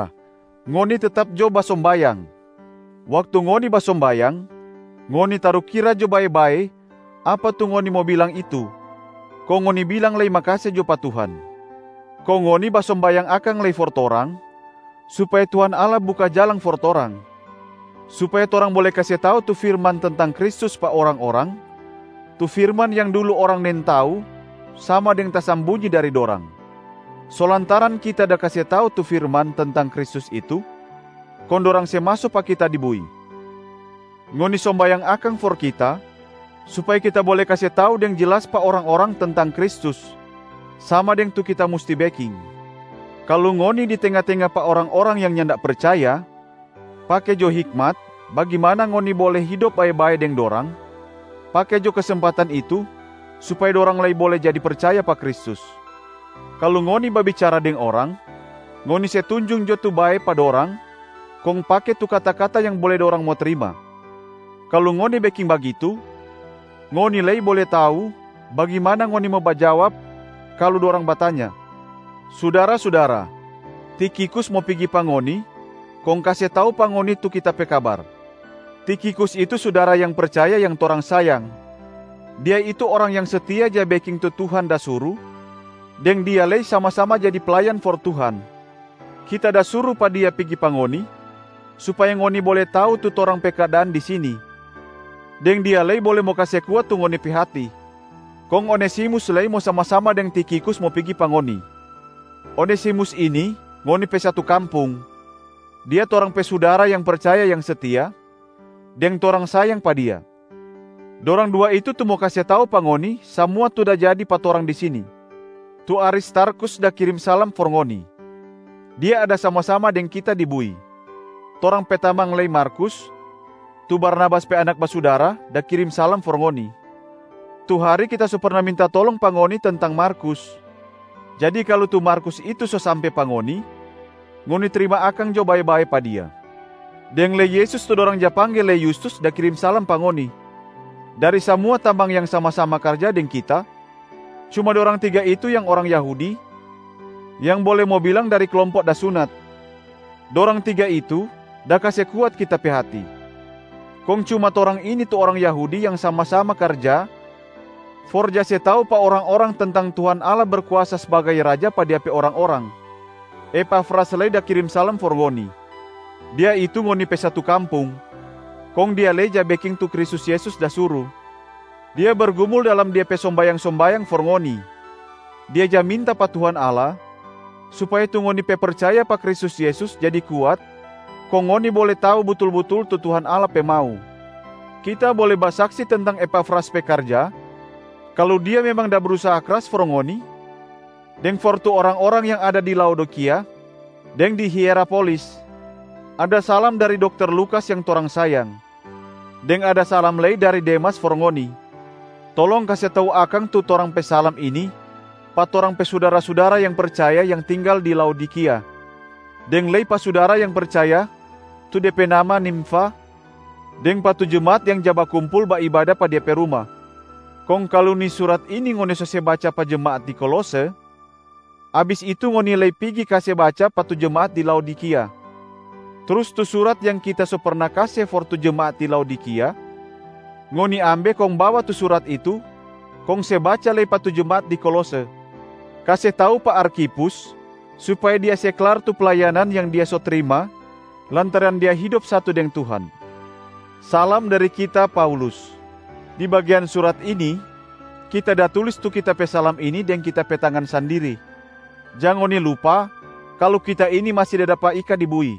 Sudara-sudara, ngoni tetap jo basombayang. Waktu ngoni basombayang, ngoni tarukira jo bae-bae apa tu ngoni mo bilang itu, kong ngoni bilang lei makase jo pa Tuhan. Kong ngoni basombayang akang lei for torang supaya Tuhan Allah buka jalang for torang, supaya torang bole kase tau tu firman tentang Kristus pa orang-orang, tu firman yang dulu orang nintau sama deng tasambunyi dari dorang. So lantaran kita da kase tau tu firman tentang Kristus itu, kong dorang se maso pa kita di bui. Ngoni sombayang akang for kita supaya kita bole kase tau deng jelas pa orang-orang tentang Kristus, sama deng tu kita musti beking. Kalu ngoni di tenga-tenga pa orang-orang yang nyanda percaya, pake jo hikmat bagimana ngoni bole hidop bae-bae deng dorang, pake jo kesempatan itu supaya dorang lei bole jadi percaya pa Kristus. Kalu ngoni babicara deng orang, ngoni se tunjung jo tu bae pa dorang kong pake tu kata-kata yang bole dorang mo trima. Kalu ngoni beking bagitu, ngoni lei bole tau bagimana ngoni mo bajawab kalu dorang batanya. Sudara-sudara, Tikhikus mo pigi pa ngoni kong kase tau pa ngoni tu kita pe kabar. Tikhikus itu sudara yang percaya yang torang sayang. Dia itu orang yang setia ja beking tu Tuhan da suru deng dia lei sama-sama jadi playan for Tuhan. Kita da suru pa dia pigi pa ngoni, supaya ngoni bole tau tu torang pe keadaan di sini, deng dia lei bole mo kase kuat tu ngoni pe hati. Kong Onesimus lei mo sama-sama deng Tikhikus mo pigi pa ngoni. Onesimus ini ngoni pe satu kampung, dia torang pe sudara yang percaya yang setia, deng torang sayang pa dia. Dorang dua itu tu mo kase tau pa ngoni samua tu da jadi pa torang di sini. Tu Aristarkhus da kirim salam for ngoni, dia ada sama-sama deng kita di bui. Torang pe tamang lei Markus, tu Barnabas pe anak basudara da kirim salam for ngoni. Tu hari kita so perna minta tolong pa ngoni tentang Markus, jadi kalu tu Markus itu so sampe pa ngoni, ngoni trima akang jo bae-bae pa dia. Deng lei Yesus tu dorang ja pangge lei Yustus da kirim salam pa ngoni. Dari samua tamang yang sama-sama karja deng kita, cuma dorang tiga itu yang orang Yahudi, yang bole mo bilang dari klompo da sunat. Dorang tiga itu da kase kuat kita pe hati. Kong cuma torang ini tu orang Yahudi yang sama-sama karja for ja se tau pa orang-orang tentang Tuhan Allah Berkuasa sbagai Raja pa Dia pe orang-orang. Epafras lei da kirim salam for ngoni, dia itu ngoni pe satu kampung, kong dia lei ja beking tu Kristus Yesus da suru. Dia bergumul dalam de pe sombayang-sombayang for ngoni. Dia ja minta pa Tuhan Allah supaya tu ngoni pe percaya pa Kristus Yesus jadi kuat kong ngoni bole tau butul-butul tu Tuhan Allah pe mau. Kita bole basaksi tentang Epafras pe karja kalu dia memang da brusaha kras for ngoni deng for tu orang-orang yang ada di Laodikia deng di Hierapolis. Ada salam dari dokter Lukas yang torang sayang, deng ada salam lei dari Demas for ngoni. Tolong kase tau akang tu torang pe salam ini pa torang pe sudara-sudara yang percaya yang tinggal di Laodikia, deng lei pa sudara yang percaya tu de pe nama Nimfa deng pa tu jemaat yang ja bakumpul baibada pa dia pe ruma. Kong kalu ni surat ini ngoni so se baca pa jemaat di Kolose, abis itu ngoni lei pigi kase baca pa tu jemaat di Laodikia. Trus tu surat yang kita so perna kase for tu jemaat di Laodikia, ngoni ambe kong bawa tu surat itu kong se baca lei pa tu jemaat di Kolose. Kase tau pa Arkhipus supaya dia se klar tu playanan yang dia so trima lantaran dia hidop satu deng Tuhan. Salam dari kita, Paulus. Di bagean surat ini, kita da tulis tu kita pe salam ini deng kita pe tangan sandiri. Jang ngoni lupa kalu kita ini masi da dapa ika di bui.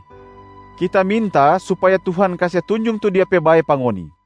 Kita minta supaya Tuhan kase tunjung tu Dia pe bae pa ngoni.